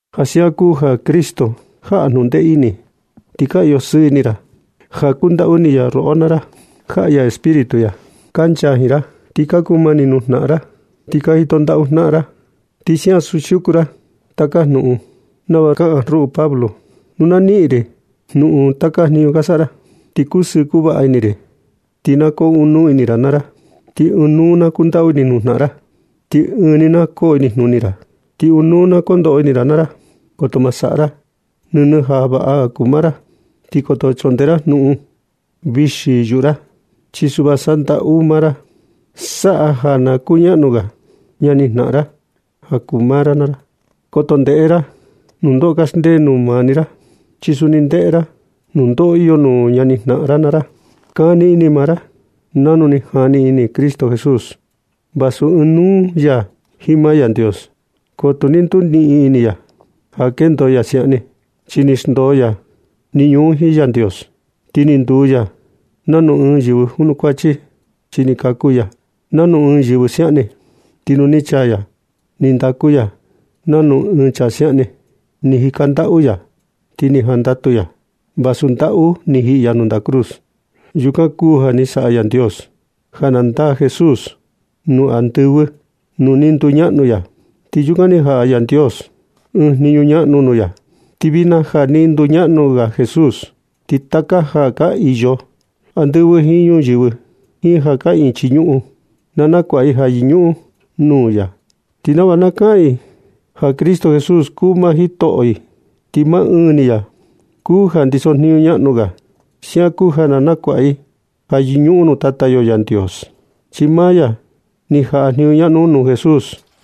Ja siaꞌan kuu ja Cristo jaꞌa jnundee ini, ti ka iyo sɨɨ ini ra. Ja kundaꞌu ini ya roꞌo naa ra, ti jaꞌa ya Espíritu ya kancha jiin ra. Ti ka kuu mani nuu jnaꞌan ra, ti ka jito ndaꞌu jnaꞌan ra. Ti siaꞌan siuku ra taka jnuꞌun nava kaꞌan ruꞌu Pablo, nu na niꞌin ri jnuꞌun taka jniñu ka saꞌa ra, ti kusɨɨ kuvaꞌa ini ri. Ti na koo ɨɨn nuu ini ra naa ra. Ti ɨɨn nuu na kundaꞌu ini nuu jnaꞌan ra. Ti ɨɨn ni na koo inijnuni ra. Ti ɨɨn nuu na kondoꞌo ini ra naa ra. Koto ma saꞌa ra nɨnɨ ja kuu ja vaꞌa maa ra, ni koto chundee ra jnuꞌun vixi yuꞌu ra. Chi suꞌva saꞌa ndaꞌu maa ra naa ra. Saꞌa na kaa ja kuñaꞌnu ga ñanijnaꞌan ra ja kuu maa ra naa ra. Koto ndeꞌe ra nundoꞌo kaxndee nuu maa ni ra, chi suni ndeꞌe ra nundoꞌo iyo nuu ñani jnaꞌan ra naa ra. Kani ini maa ra nanu ni jani ini Cristo Jesús. Vasu ɨɨn nuu ya jiin maa Yandios, ko tu ni nduniꞌin ini ya ja kendo ya siaꞌan ni. Chi ni xndoo ya jniñu un jiin Yandios ti ni nduu ya nanu ɨɨn yɨvɨ junukuachi, chi ni kaku ya nanu ɨɨn yɨvɨ siaꞌan ni. Ti nu ni chaa ya, ni ndaku ya nanu ɨɨn chaa siaꞌan ni. Ni jika ndaꞌu ya, ti ni jandatu ya vasu ndaꞌu ni jiꞌi ya nuu ndaꞌa cruz. Yukan kuu ja ni saꞌa Yandios ja na ndaa Jesús nuu andɨvɨ nuu ni nduñaꞌnu ya. Ti yukan ni jaꞌa Yandios ɨɨn jniñu ñaꞌnu nuu ya. Ti vijna ja ni nduñaꞌnu ga Jesús, ti taka ja ka iyo andɨvɨ jiin ñuyɨvɨ jiin ja kaꞌiin chii ñuꞌun, na nakuaꞌa i ja yɨñuꞌun nuu ya, ti nava na kaꞌan i ja Cristo Jesús kuu maa Jitoꞌo i ti maa ɨɨn ni ya kuu ja ndiso jniñu ñaꞌnu ga. Siaꞌan kuu ja na nakuaꞌa i ja yɨñuꞌun nuu Tata yo Yandios, chi maa ya ni jaꞌa jniñu ñaꞌnu un nuu Jesús.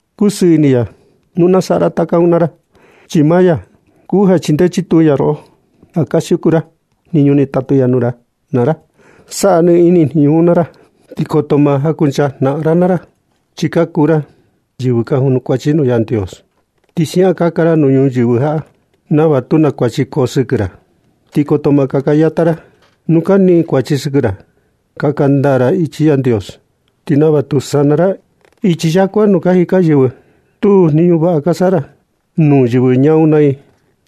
Kusɨɨ ini ya nu na saꞌa ra taka un naa ra, chi maa ya kuu ja chindee chituu roꞌo, ja ka siuku ra jniñu ni tatu ya nuu ra naa ra. Saꞌa nɨ ini jniñu un naa ra, ti koto ma jankuncha jnaꞌan ra naa ra. Chi ka kuu ra yɨvɨ ka junukuachi nuu Yandios, ti siaꞌan kaka ra nuu ñuyɨvɨ jaꞌa, nava tu naa kuachi koo sɨkɨ ra, ti koto ma na kaka yata ra nu ka niꞌin kuachi sɨkɨ ra. Kaka ndaa jiin ichi Yandios, ti nava tu sana ra ichi yakua nuu ka jika yɨvɨ ñaa. Stuu jniñu vaꞌa ka saꞌa ra nuu yɨvɨ ñaa un naa i,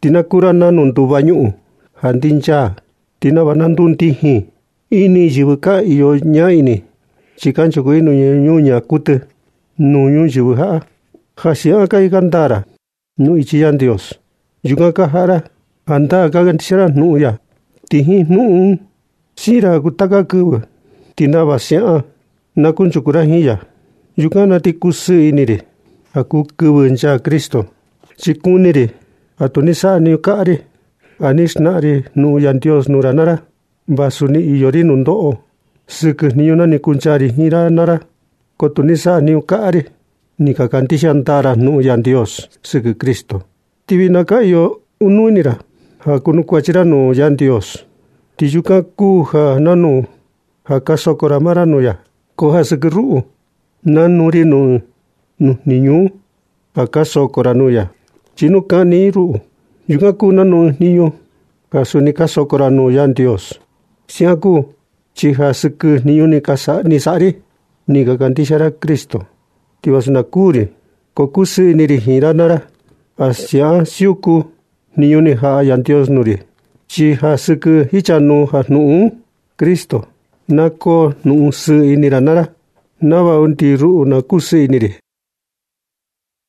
ti na kuu ra nanu nduva ñuꞌun ja ndinchaa. Ti nava na ndundijin ini yɨvɨ ka iyo ñaa ini, chi kanchuku i nuu ñuñaa kuɨtɨ nuu ñuyɨvɨ jaꞌa. Ja siaꞌan ka jika ndaa ra nuu ichi Yandios, yukan ka jaꞌa ra jandaa ja ka kandixia ra jnuꞌun ya, ti jiin jnuꞌun un siin ra ja kuu taka kɨvɨ, ti nava siaꞌan na kunchuku ra jiin ya. Yukan na ti kusɨɨ ini ri ja kuu kɨvɨ nchaa Cristo, chi kuni ri ja tu ni saꞌa jniñu kaꞌa ri ja ni xnaꞌan ri jnuꞌun Yandios nuu ra naa ra. Vasu ni iyo ri nundoꞌo sɨkɨ jniñu na ni kuncha ri jiin ra naa ra, ko tu ni sajniñu kaꞌa ri. Ni ka kandixia ndaa ra jnuꞌun Yandios sɨkɨ Cristo. Ti vijna ka iyo nɨ ini ra ja kunukuachi ra nuu Yandios, ti yukan kuu nanu ja ka soko ra maa ra nuu ya. Ko ja sɨkɨ ruꞌu, nanu ri nuu ɨɨn nuu jniñu un ja ka soko ra nuu ya. Chi nu kaꞌni i ruꞌu, yukan kuu nanu ɨɨn jniñu ja suni ka soko ra nuu Yandios. Siaꞌan kuu chi ja sɨkɨ jniñu ni saꞌa ri un ni ka kandixia ra Cristo. Ti vasu na kuū ri, ko kusɨɨ ini ri jiin ra naa ra ja siaꞌan siuku jniñu ni jaꞌa Yandios nuu ri. Chi ja sɨkɨ jichanuu jnuꞌun Cristo na koo jnuꞌun sɨɨ ini naa ra nava suni undi ruꞌu na kusɨɨ ini ri.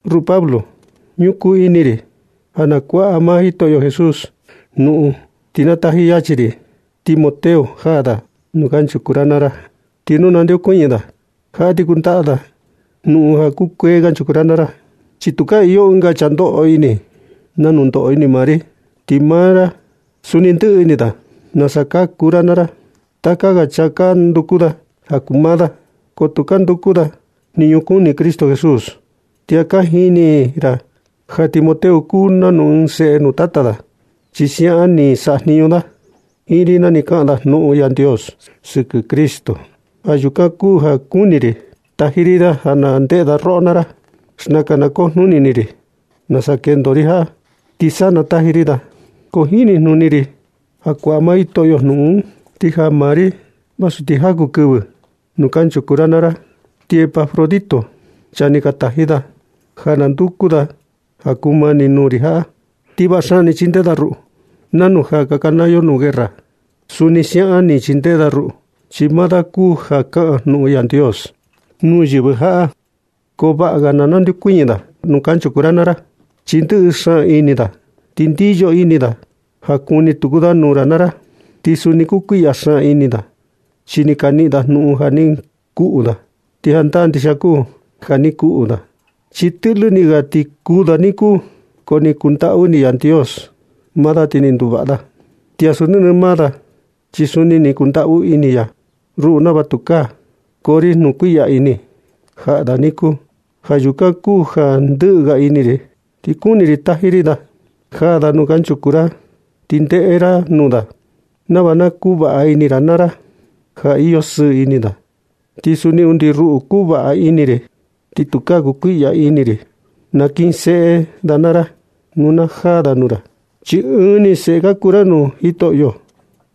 Ruꞌu Pablo, ñukuu ini ri ja na kuaꞌa maa Jitoꞌo Jesús jnuꞌun, ti na taji yachi ri Timoteo jaa da nuu kanchuku ra naa ra. Ti nu nandeokuñɨ da jaꞌa ti kundaꞌa da jnuꞌun ja kukuee kanchuku ra naa ra. Chi tukaa iyo ɨnga chaa ndoꞌo ini nanu ndoꞌo ini maa ri, ti maa da suni ndɨꞌɨ ini da nasa ka kuu ra naa ra. Taka ga chaa ka nduku da ja kuu maa da, ko tu ka nduku da jniñu kuni Cristo Jesús. Ti ja ka jini ra ja Timoteo kuu nanu ɨɨn seꞌe nuu tata da, chi siaꞌan ni sajniñu da jiin ri na ni kaꞌan da jnuꞌun Yandios sɨkɨ Cristo. Ja yukan kuu ja kuni ri taji ri da na jandeꞌe da roꞌo naa ra. Ko xnakan na kujnuni ini ri nasa kendo ri jaꞌa, ti sa na taji ri da. Ko jinijnuni ri ja kuaꞌa maa Jitoꞌo jnuꞌun, ti jaa maa ri vasu ti jaku kɨvɨ nuu kanchuku ra naa ra. Ti Epafrodito, chaa ni ka taji ra ja na nduku da ja kumani nuu ri jaꞌa, ti vaꞌa xaan chindee da ruꞌu. Nanu ja ka kanaa yo nuu guerra, suni siaꞌan ni chindee da ruꞌu, chi maa da kuu ja kaꞌan jnuꞌun Yandios nuu yɨvɨ jaꞌa. Ko vaꞌa ga ja na nandeokuñɨ da nuu kanchuku ra naa ra. Chi ndɨꞌɨ xaan ini da, ti ndiyo ini da ja kuni tuku da nuu ra naa ra. Ti suni kukuiꞌya xaan ini da, chi ni ka niꞌin ra jnuꞌun ja ni kuꞌu da. Ti jandaa ndixia kuu ja ni kuꞌu da, chi tɨꞌlɨ ni ga ti kuū da niku, ko ni kundaꞌu ini Yandios maa da ti ni nduvaꞌa da. Ti ansu nɨnɨ maa da, chi suni ni kundaꞌu ini ya ruꞌu nava tukaa koo ri jnuꞌun kuiꞌya ini jaꞌa da niku. Ja yukan kuu ja ndɨꞌɨ ga ini ri, ti kuni ri taji ri da jaa da nuu kanchuku ra, ti ndeꞌe ra nuu da nava na kuvaꞌa ini ra naa ra ja iyo sɨɨ ini da. Ti suni undi ruꞌu kuvaꞌa ini ri, ti tukaa kukuiꞌya ini ri. Nakinseꞌe da naa ra nu na najaa da nuu ra, chi ɨɨn ni seꞌe ka kuu ra nuu Jitoꞌo.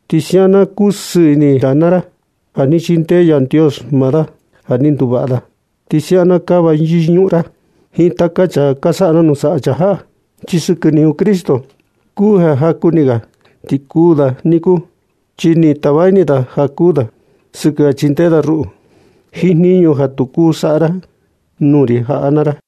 Ti siaꞌan na kusɨɨ ini ra naa ra ja ni chindee Yandios maa da ja ni nduvaꞌa da. Ti siaꞌan na kava yɨñuꞌun ra jiin taka chaa ka saꞌa nanu saꞌa chaa jaꞌa. Chi sɨkɨ jniñu Cristo kuu ja jaku ni ga, ti kuu da niku. Chi ni tava ini da ja kuū da sɨkɨ ja chindee da ruꞌu jiin jniñu ja tu kuu saꞌa ra nuu ri jaꞌa naa ra.